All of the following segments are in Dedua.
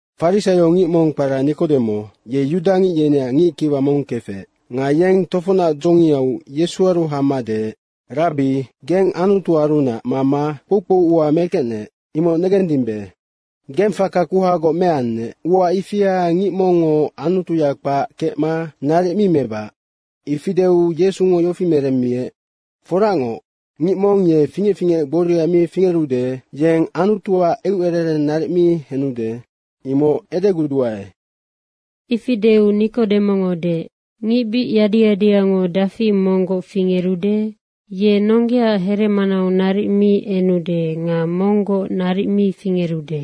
Farisaiongic mong kpara Nikodemo, ye yudangic yeneac ngickiwa mong kefec. Nga yeng tofocnac dzongiau Yesuaru hama deec, “Rabbi, geng Anutuarunac mama kpoukpou ua mekecnec, imoc negendimbe. Geng faka kuhagoc meannec, ua ifia ngic mongngo Anutuya kpac kecma naric mi mebac.” Ifi deu Yesungo yofi meremmiec, “Foracngoc, ngic mong ye fingec fingec gboria mi fingerude, yeng Anutuac eucerereng naric mi henude, imoc edeguduae.” Ifi deu Nikodemongo deec, “Ngic bic yadi yadiyango dafi monggoc fingerude? Ye nonggeaac heremanau naric mi enude nga monggoc naric mi fingerude.”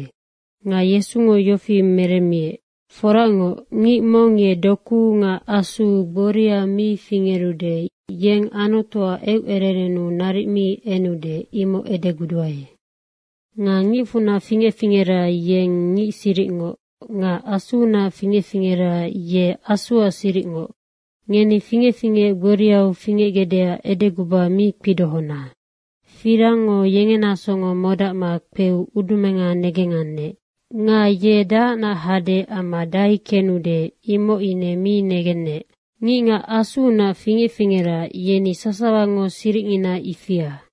Nga Yesungo yofi meremmiec, “Foracngoc, ngic mong ye dokuu nga Asuu gboria mi fingerude, yeng Anutuac eucererennu naric mi enude, imoc edeguduae. Nga ngicfunac fingec fingera, yeng ngic siricngoc nga Asuunac fingec fingera, ye Asu siricngoc. Ngeni fingec fingec gboriau fingecgecdeac edeguba mi kpidohona. Firangngo yengena songo modacma kpeu udumenga negengannec. Nga ye dahacnac hade amma dahai kenude, imoc ine mi negennec. Ngicngac Asuunac fingec fingera, yeni sasawango siricngina ifia.”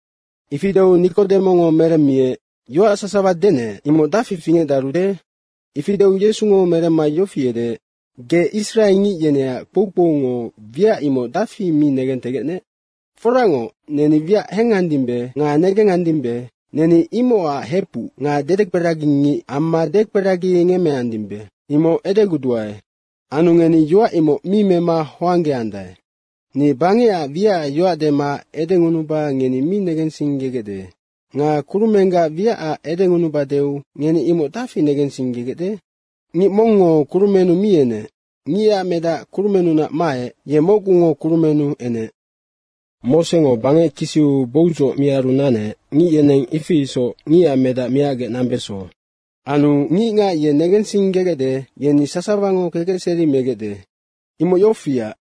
Ifi deu Nikodemongo meremmiec, “Yoac sasawa denec, imoc dafi fingecdarude?” Ifi deu Yesungo meremma yofi edeec, “Ge israengic yeneac kpoukpoungo wiac imoc dafi mi negentegecnec? Foracngoc, neni wiac hengandimbe nga negengandimbe, neni imocac hepuc nga dedekperagingic amma dekperagingemmeandimbe, imoc edeguduae. Anu ngeni yoac imoc mi mema honggeandae. Ni bangecac wiacac yoac dema edengunuba ngeni mi negensinggegecde. Nga kurumenggac wiacac edengunubadeu ngeni imoc dafi negensinggegecde? Ngic mongngo kurumennu mi enec. Ngicac medac kurumennunac maec, ye mocgungo kurumennu enec. Mosengo bangec kisiu boudzoc miaru nanec, ngic yeneng ifi isoc Ngicac Medac miacgec nambeso. Anu ngicngac ye negensinggegecde, yeni sasawango kekecseri megecde. Imoc yofiac,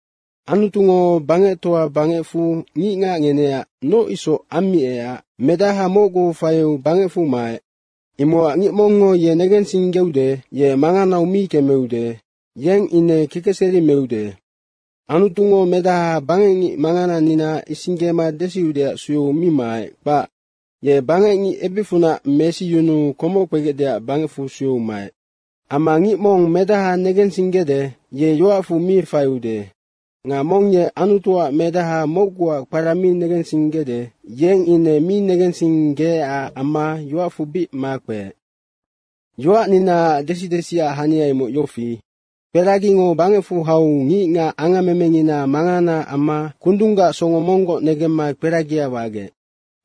Anutungo bangectoa bangecfu ngicngac ngeneac noc isoc ammiecac Medaha mocgu faiu bangecfu maec. Imocac ngic mongngo ye negensinggeude, ye manganau mi kemeude yeng ine kekecseri meude. Anutungo Medaha bangecngic manganangina isinggema desiudeac sueu mi maec, kpac. Ye bangecngic ebicfunac mesiyunuu komoc kpegecdeac bangecfu sueu maec. Amma ngic mong Medaha negensinggede, ye yoacfu mi faiude. Nga mong ye Anutuac Medaha mocguac kpara mi negensinggede, yeng ine mi negensinggeecac amma yoacfu bic makpeec. Yoacninaac desi desiac hania imoc yofi, kperagingo bangecfu hau ngicngac angammemengina manganaac amma kundunggac songo monggoc negemma kperagia wagec.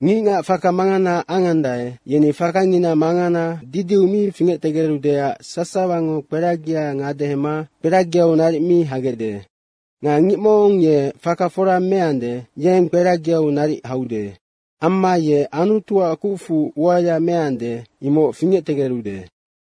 Ngicngac faka mangana angandae, yeni fakangina mangana didiu mi fingectegerudeac sasawango kperagia ngadehema kperagiau naric mi hagecde. Nga ngic mong ye faka fora meande, yeng kperagiau naric haude. Amma ye Anutuac kucfu uaya meande, imoc fingectegerude.”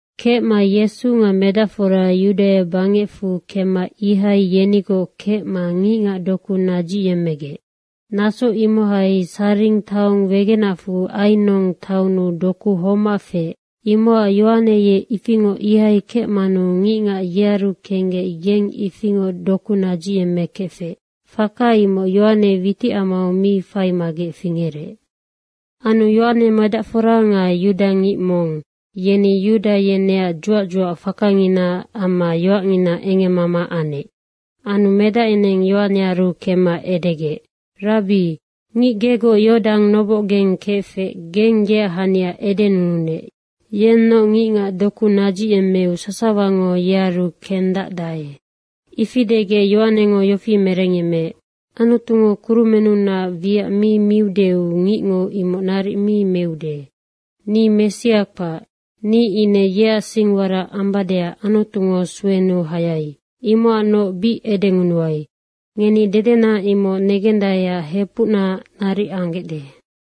Kecma Yesu nga medacfora Yudaia bangecfu kemma ihai yenigoc kecma ngicngac doku nadzicyemmegec. Naso imohai Saring taong wegenacfu Ainong taonnu doku homac feec. Imocac Yohane ye ifingoc ihai kecmanu ngicngac yearu kenggec yeng ifingoc doku nadzicyemmekefec. Faka imoc Yohane witicamau mi faimagec fingerec. Anu Yohane medacfora nga yudangic mong, yeni yuda yeneac dzuac dzuac fakanginaac amma yoacngina engemmama anec. Anu medac yeneng Yohanearu kemma edegec, “Rabbi, ngic gegoc Yordang nobocgeng kefec geng yeac hania edenununec, yennoc ngicngac doku nadzicyemmeu sasawango yearu kendacdae.” Ifi degec Yohanengo yofi merengyemmeec, “Anutungo kurumennunac wiac mi miudeu ngicngo imoc naric mi meude. Ni Messia kpac. Ni ine yeac singwarac ambadeac Anutungo suenuu hayai. Imocacnoc bic edengunuai, ngeni dedena imoc negendaeac hepucna naric anggecde.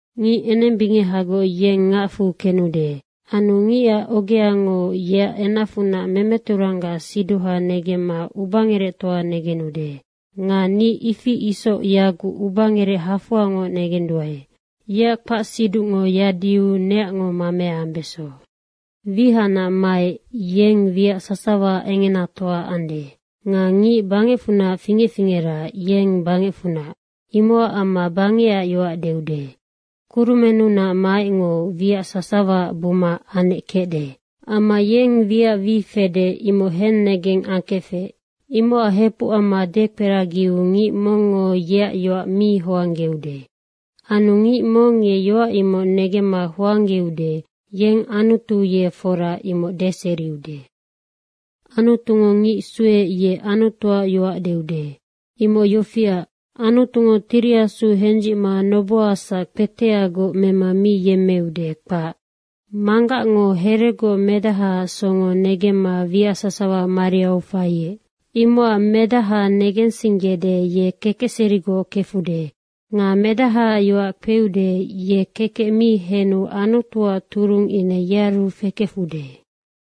Ngic enembingehagoc yeng ngacfu kenude. Anu ngicac ogeango yeac enacfunac memeturanggac siduha negemma ubangerectoa negenude. Nga ni ifi isoc yaguc ubangerec hafoangoc negenduae. Yeac kpacsiducngo yadiu neacngo mamea ambeso. Wihacnac maec, yeng wiac sasawaac engenatoa ande. Nga ngic bangecfunac fingec fingera, yeng bangecfunac, imocac amma bangecac yoac deude. Kurumennunac maecngo wiac sasawaac buma anec kecde. Amma yeng wiac wi fede, imoc hennegeng angkefec, imocac hepuc amma dekperagiu ngic mongngo yeac yoac mi hoanggeude. Anu ngic mong ye yoac imoc mema hoanggeude, yeng Anutu ye fora, imoc deseriude. Anutungo ngic sueec ye Anutuac yoac deude. Imoc yofiac, Anutungo Tiri Asu hendzicma nobohasac kpeteagoc mema mi yemmeude, kpac. Manggacngo heregoc Medahaac songo negemma wiac sasawa mariau faiec. Imocac Medaha negensinggede, ye kekecserigoc kefude. Nga Medahaac yoac kpeude, ye kekec mi henu Anutuac turung ine yearu fekefude.”